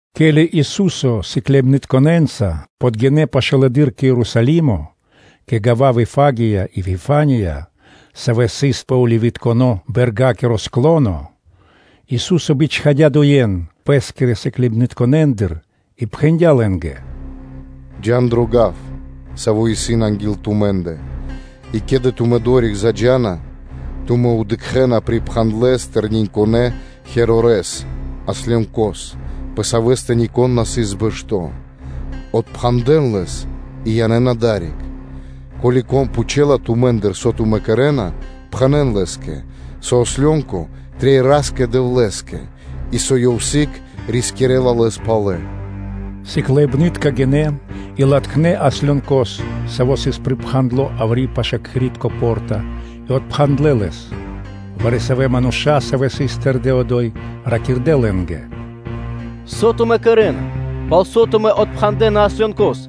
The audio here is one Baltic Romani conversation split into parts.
Ке́ли Ису́со сыкляибнытконэ́нца подгинэ́ пашылэды́р кэ Ерусалимо кэ гава́ Вифагия и Вифания, савэ́ сыс пэ Оливитконэ – бэрга́киро склоно, Ису́со бичхадя́ дуе́н Пэ́скирэ сыкляибнытконэндыр, и пхэндя́ лэ́нгэ: “Джа́н дро гав, саво́ исын анги́л тумэ́ндэ, и ке́ли тумэ́ одори́к заджа́на, тумэ́ дыкхэ́на припхандлэ тэрниньконэ ослёнкос (мегарори́с), пэ савэ́стэ нико́н на сыс бэшто́. Отпхандэн лэс и янэ́н адари́к. Ко́ли кон пхучэла тумэ́ндыр, со тумэ́ кэрэ́на, пхэнэ́н лэ́скэ: ‘Ослёнко трэй Ра́скэ-Дэвлэ́скэ’, и ‘Со Ёв сыг рискирэ́ла лэс палэ.’” Сыкляибны́тка гинэ́, и латхнэ́ ослёнкос, саво́ сыс припхандло яври́ пашы́л кхэри́тко по́рта и отпхандлэ лэс. Вари-савэ́ мануша́, савэ́ сыс тэрдэ́ одо́й, ракирдэ́ лэ́нгэ: “Со тумэ́ кэрэ́на? Палсо́ тумэ́ отпхандэна ослёнкос?”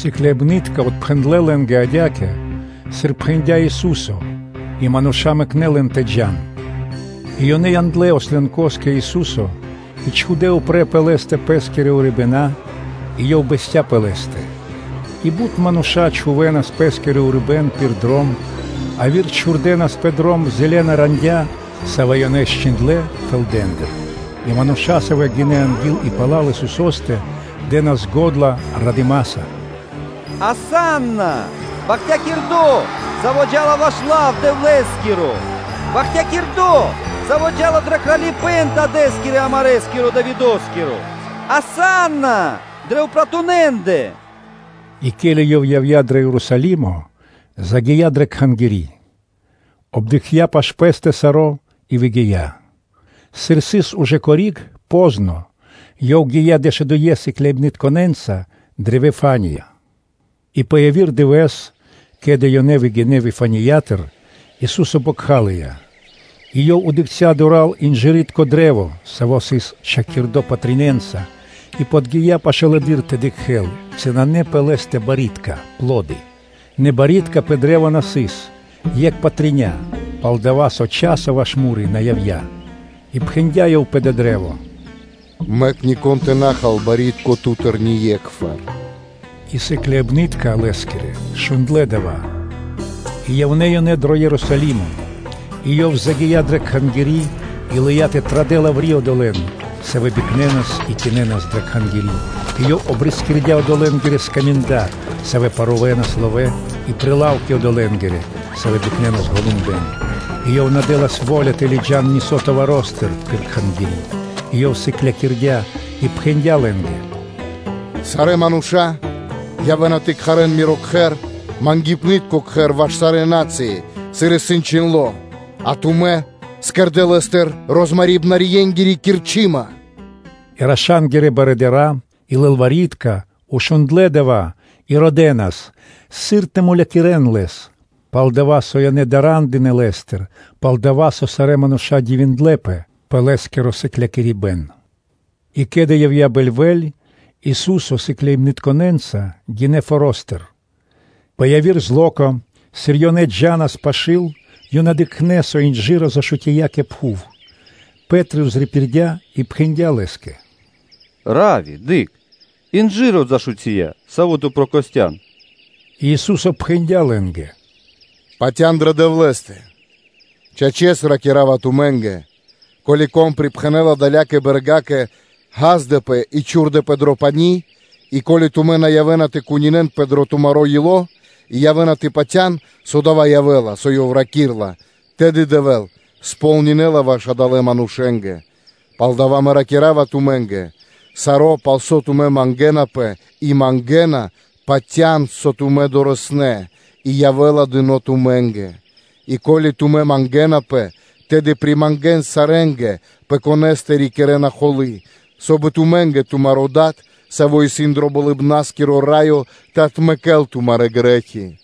Сыкляибны́тка отпхэндлэ́ лэ́нгэ адя́кэ, сыр пхэндя́ Ису́со, и мануша́ мэкнэ́ лэн тэ джа́н. И ёнэ яндлэ́ ослёнкос кэ Ису́со и чхудэ́ упрэ́ пэ лэ́стэ пэ́скирэ урибэна́, и Ёв бэсця́ пэ лэ́стэ. И бут мануша́ чхувэ́нас пэ́скиро урибэ́н пир дром, яви́р чхурдэнас пэ дром зэлэна рандя́, савэ́ ёнэ счхиндлэ фэлдэндыр. И мануша́, савэ́ гинэ́ анги́л и пала́л Исусо́стэ, дэ́нас го́дла радыма́са: – “Асанна! Бахтякирдо́, Саво́ джа́ла ваш лав Дэвлэ́скиро! Бахтякирдо́, Саво́ джа́ла дро Кралипэ́н Дадэ́скирэ амарэскиро Давидо́скиро! – “Асанна дрэ упратунэндэ!” И ке́ли Ёв явдя́ дро Ерусалимо, загия́ дрэ Кхангири́; обдыкхця пашы́л Пэ́стэ саро́ и выгия́. Сыр сыс ужэ кори́г (познэс), то Ёв гия́ дэшудуе́ сыкляибнытконэ́нца дрэ Вифания. И пэ яви́р дывэ́с, ке́ли ёнэ выгинэ́ Вифаниятыр, Ису́со бокхалыя; и Ёв дыкхця́ дура́л инжыритко кашт (дрэ́во), саво́ сыс чхакирдо патренца (листэнца) и подги́я пашылэды́р тэ дыкхэ́л, ци исын пэ лэ́стэ барьякирдэ́ (пло́ды). Нэ барьякирдэ́ пэ кашт на сыс, екх патря, пал-дова́, со часо ваш му́ри на явдя́. И пхэндя́ Ёв пэ дава́ кашт: “Мэк нико́н тэ на хал барьякирдо́ ту́тыр ние́кхвар.” И сыкляибны́тка Лэ́скирэ шундлэ́ дава́. И явнэ́ ёнэ дро Ерусалимо. И Ёв загия́ дрэ Кхангири́ и лыя́ тэ традэл яври́ одолэ́н, савэ́ бикнэнас и кинэнас дрэ Кхангири́; и Ёв обрискирдя одолэнгирэ скаминда, савэ́ парувэнас ловэ́ и прилавки одолэнгирэ, савэ́ бикнэнас голумбэн: и Ёв на дэ́лас во́ля тэ лыджа́н нисо́ товаростыр (арцикулэндыр) пирда́л Кхангири́; и Ёв сыклякирдя́ и пхэндя́ лэ́нгэ: “Сарэ́ манушэ явэ́на тэ кхарэ́н Миро кхэр ‘Мангипнытко кхэр’ ваш сарэ́ на́цыи, сыр исын чхиндло́?’ А тумэ́ кэрдэ́ лэ́стыр розмарибнарьенгири кирчыма.” И раша́нгирэ барыдыра́ и лылвари́тка шундлэ́ дава́ и родэнас, сыр тэ мулякирэ́н Лэс; пал-дова́ со ёнэ дара́ндынэ Лэ́стыр, пал-дова́ со сарэ́ мануша́ дивиндлэ́пэ пэ Лэ́скиро сыклякирибэ́н. И ке́ли явдя́ бэльвэ́ль, Ису́со сыкляибнытконэ́нца гинэ́ форо́стыр. Тася́рлэс (ра́нэс) пэ яви́р дывэ́с, сыр ёнэ джа́нас пашы́л, ёнэ дыкхнэ́, со инжыро зашутия кэ пхув. Пэ́три пририпирдя и пхэндя́ Лэ́скэ: “Равви! Дыкх, инжыро зашутия, саво́ Ту прокостян!” И Ису́со пхэндя́ лэ́нгэ: “Патя́н дрэ Дэвлэ́стэ!” Чачэс ракира́ва тумэ́нгэ: “Ко́ли кон припхэнэла далякэ бэргакэ: ‘Ѓаздэпэ и чхурдэпэ дро пани́’ и, ко́ли тумэ́ на явэ́на тэ кунинэнпэ дро тумаро́ ило́, и явэ́на тэ патя́н, со явэ́ла дова́, со ёв ракирэ́ла, тэды Дэвэ́л сполнинэла ваш адалэ́ манушэ́скэ. Палдава́ Мэ ракира́ва тумэ́нгэ: саро́, пал со тумэ́ мангэ́напэ и мангэна, патя́н, со тумэ́ дорэснэ́ (долынэ), и явэ́ла дыно́ тумэ́нгэ. И ко́ли тумэ́ мангэ́напэ, тэды примангэн сарэ́нгэ, пэ конэ́стэ рикирэ́на холы́, соб (кай) и тумэ́нгэ тумаро́ Дад, Саво́ исын дро Болыбна́скиро Раё, тэ отмэкэ́л тумарэ́ грэ́хи.”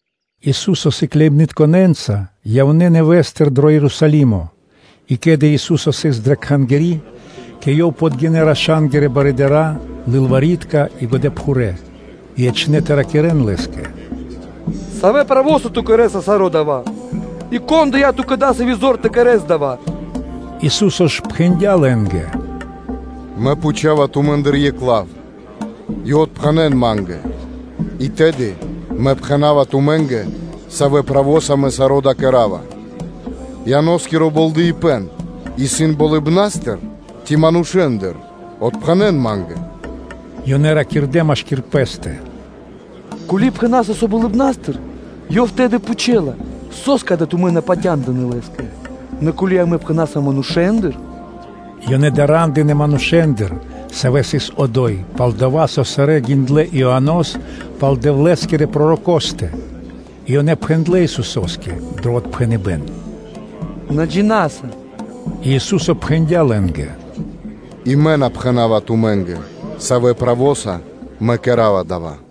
Ису́со сыкляибнытконэ́нца явнэ́ нэвэ́стыр дро Ерусалимо. И ке́ли Ису́со сыс дрэ Кхангири́, кэ Ёв подгинэ́ раша́нгирэ барыдыра́, лылвари́тка и годэпхурэ́. И ячнэ́ тэ ракирэ́н Лэ́скэ: “Савэ зорья́са Ту кэрэ́са саро́ дава́? И кон дыя́ Ту́кэ дасави́ зор тэ кэрэ́с дава́?” Ису́со ж пхэндя́ Лэ́нгэ: “Мэ пхучава тумэ́ндыр екх лав и отпхэнэн Ма́нгэ, и тэды Мэ пхэна́ва тумэ́нгэ, савэ́ зорья́са Мэ кэра́ва саро́ дава́. Ианоскиро болдэипэн исын болыбна́стыр ци манушэ́ндыр? Отпхэнэн Ма́нгэ.” Ёнэ ракирдэ́ машки́р пэ́стэ: ‘Ко́ли пхэна́са, со болыбна́стыр’, Ёв тэды пхучэла: ‘Со́скэ тумэ́ на патяндынэ́ Лэ́скэ?’ Нэ ко́ли амэ пхэна́са: ‘Манушэ́ндыр’ – ёнэ дара́ндынэ манушэ́ндыр, савэ́ сыс одо́й, пал-дова́ со сарэ́ гиндлэ́ Ианос пал Дэвлэ́скирэ пророкостэ. И ёнэ пхэндлэ́ Исусо́скэ дро отпхэныбэ́н: “На джина́са.” И Ису́со пхэндя́ лэ́нгэ: “И Мэ на пхэна́ва тумэ́нгэ, савэ́ зорья́са Мэ кэра́ва дава́.”